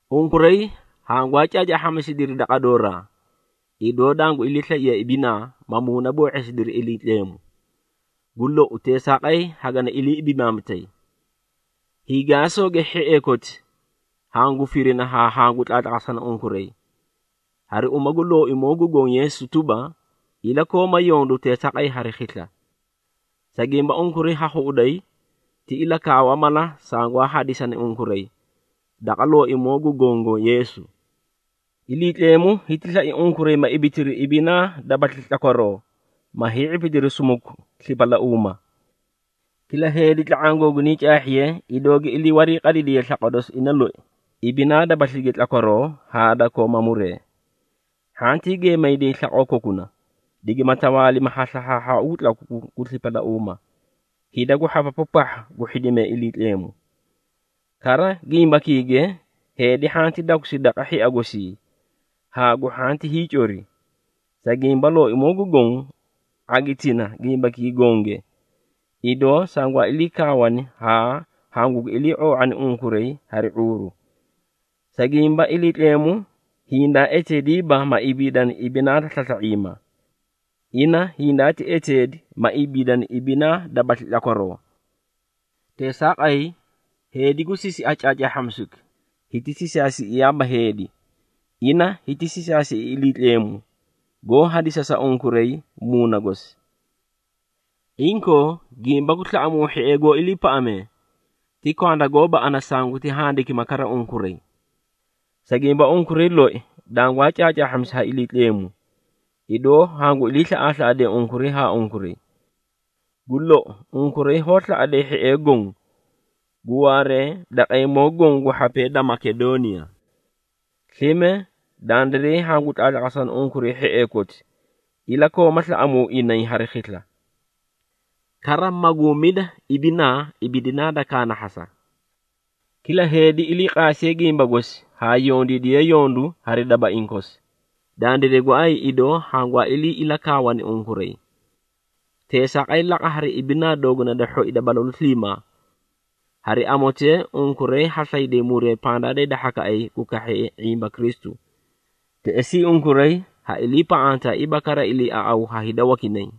Unkuray hangwaa caacaahhamisidiri daqa dooraa, idoo dangu iliislaiye ibinaa, ma muunaboo⁄eesidiri Iliitleemu. Gu lou, teesaaqay hagani ilii ibimaamitay. Hiigaasooge hhiee koti, hangu firina haa hangu tlaatlaqasana unkuray, hari uma gu Looimoo gu Goõ Yeesu tuba, ilakooma yondu teesaaqay hari khisla. Sa gimba, unkuray ha khuꞌuday, ti ilakaawa mala sangwaa hadisani unkuray, daqa Looimoo gu Gongo Yeesu. Iliitleemu hiti slai unkuray ma ibitiri ibinaa dabasli tlakwaroo, ma hii⁄ipidiri sumuku slipalauuma. Kila heedi tla⁄aã googunay caahhiye, idoo gi ilii warii qadidiye slaqwa dosi ina loi, ibinaa dabaslige tlakwaroo haa da kooma muree. Hhantii geemayday slaqoo kokuna, digima tawaalimi ha slahhaahhaau gu tlaku gu slipalauuma, hida gu hhapapu pahha gu hhidimee Iliitleemu. Kara gimbakiige, heedi hhanti dakusi daqa hhia gosii, haa gu hhanti hiicori. Sa gimba Looimoo gu Goõ, ⁄agitina gimbakii gonge, idoo sangwaa ilii kaawani haa hangugi ilii⁄oo⁄ani unkuray hari ⁄uuru. Sa gimba, Iliitleemu hindaa eteediiba ma ibiidani ibinaa da slasla⁄iima. Ina hindaati eteedi, ma ibiidani ibinaa dabasli tlakwaroo. Teesaaqay, heedi gu sisia caacaahhamisuki, hiti sisaasiꞌiyaaba heedi. Ina hiti sisaasiꞌi Iliitleemu, goó hadisa sa unkuray Muuna gosi. Inkoo, gimba gu slaꞌamuu hhiee goó iliipaꞌamee, ti kwanda gooba ana sanguti handikima kara unkuray. Sa gimba, unkuray loi dangwaa caacaahhamisi ha Iliitleemu, idoo hangu ilii slaꞌaaslaꞌadee unkuray haa unkuray. Gu lou, unkuray hoó slaꞌaday hhiee goõ, gu waaree daqeemoo goõ gu hhapee da Makedooniya. Slime, dandiray hangu tlaatlaqasana unkuray hhiee koti, ilakooma slaꞌamuu inay hari khisla. Kara, maguumida ibinaa ibidinaa da kaanahhasa. Kila heedi ilii qaasiye gimba gosi haa yondiidiye yondu hari dabaiĩ kosi, dandiray gooay idoo hangwaa ilii ilakaawani unkuray. Teesaaqay laqa, hari ibinaa dooguna da hhoi da balalu sliimaa. Hari amotee, unkuray ha slayday muree pandaa da hida hhakaꞌay gu kahhee ⁄imba Kristu. Teꞌesii, unkuray ha iliipaꞌantaaiiba kara iliiaꞌaw ha hida wakinay.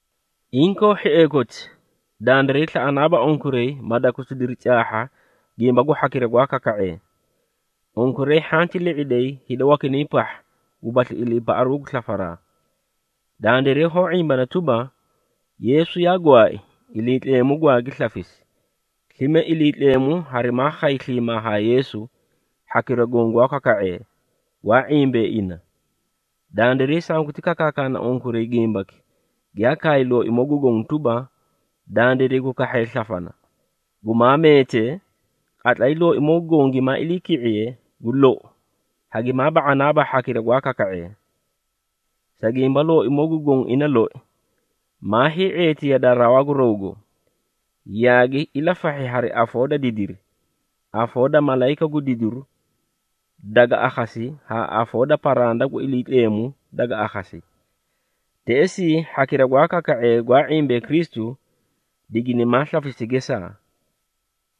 Inkoo hhiee koti, dandiray slaꞌanaaba unkuray ma dakusidiri caahha gimba gu hhakira gwaa kaka⁄ee. Unkuray hhanti li⁄iday hida wakinay pahha, gubasli iliipaꞌaru gu slafaraa. Dandiray hoó ⁄imbana tuba, Yeesu yaa gwaai, Iliitleemu gwaagi slafisi, slime Iliitleemu harimaa khay sliimaa haa Yeesu, hhakira goõ gwaa kaka⁄ee, gwaa ⁄imbee ina. Dandiray sanguti kakaakana unkuray gimbaki giyaa kaay Looimoo gu Goõ tuba, dandiray gu kahhee slafana, gumaa meetee, qatlay Looimoo gu Goõ gimaa iliiki⁄iye, gu lou, hagimaa ba⁄anaaba hhakira gwaa kaka⁄ee. Sa gimba, Looimoo gu Goõ ina loi, maa hii⁄eeti yadaa rawaa gu rawgo, yaagi ilafahhi hari afoo da didiri, afoo da malayika gu didiru daga akhasi haa afoo da paranda gu Iliitleemu daga akhasi. Teꞌesii hhakira gwaa kaka⁄ee gwaa ⁄imbee Kristu, diginimaa slafisi gesaa.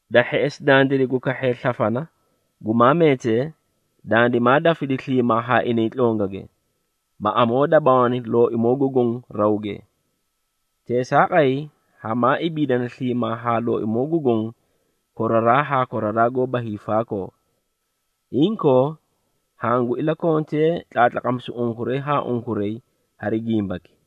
Da hheꞌesi, dandiray gu kahhee slafana, gumaa meetee, dandimaa dafidi sliimaa haa inay tlongage, ma amoodabaawani Looimoo gu Goõ rawge. Teesaaqay, hamaa ibiidana sliimaa haa Looimoo gu Goõ koraraa haa koraraa goóba hiifaakoo. Inkoo, hangu ilakontee tlaatlaqamisu unkuray haa unkuray hari gimbaki.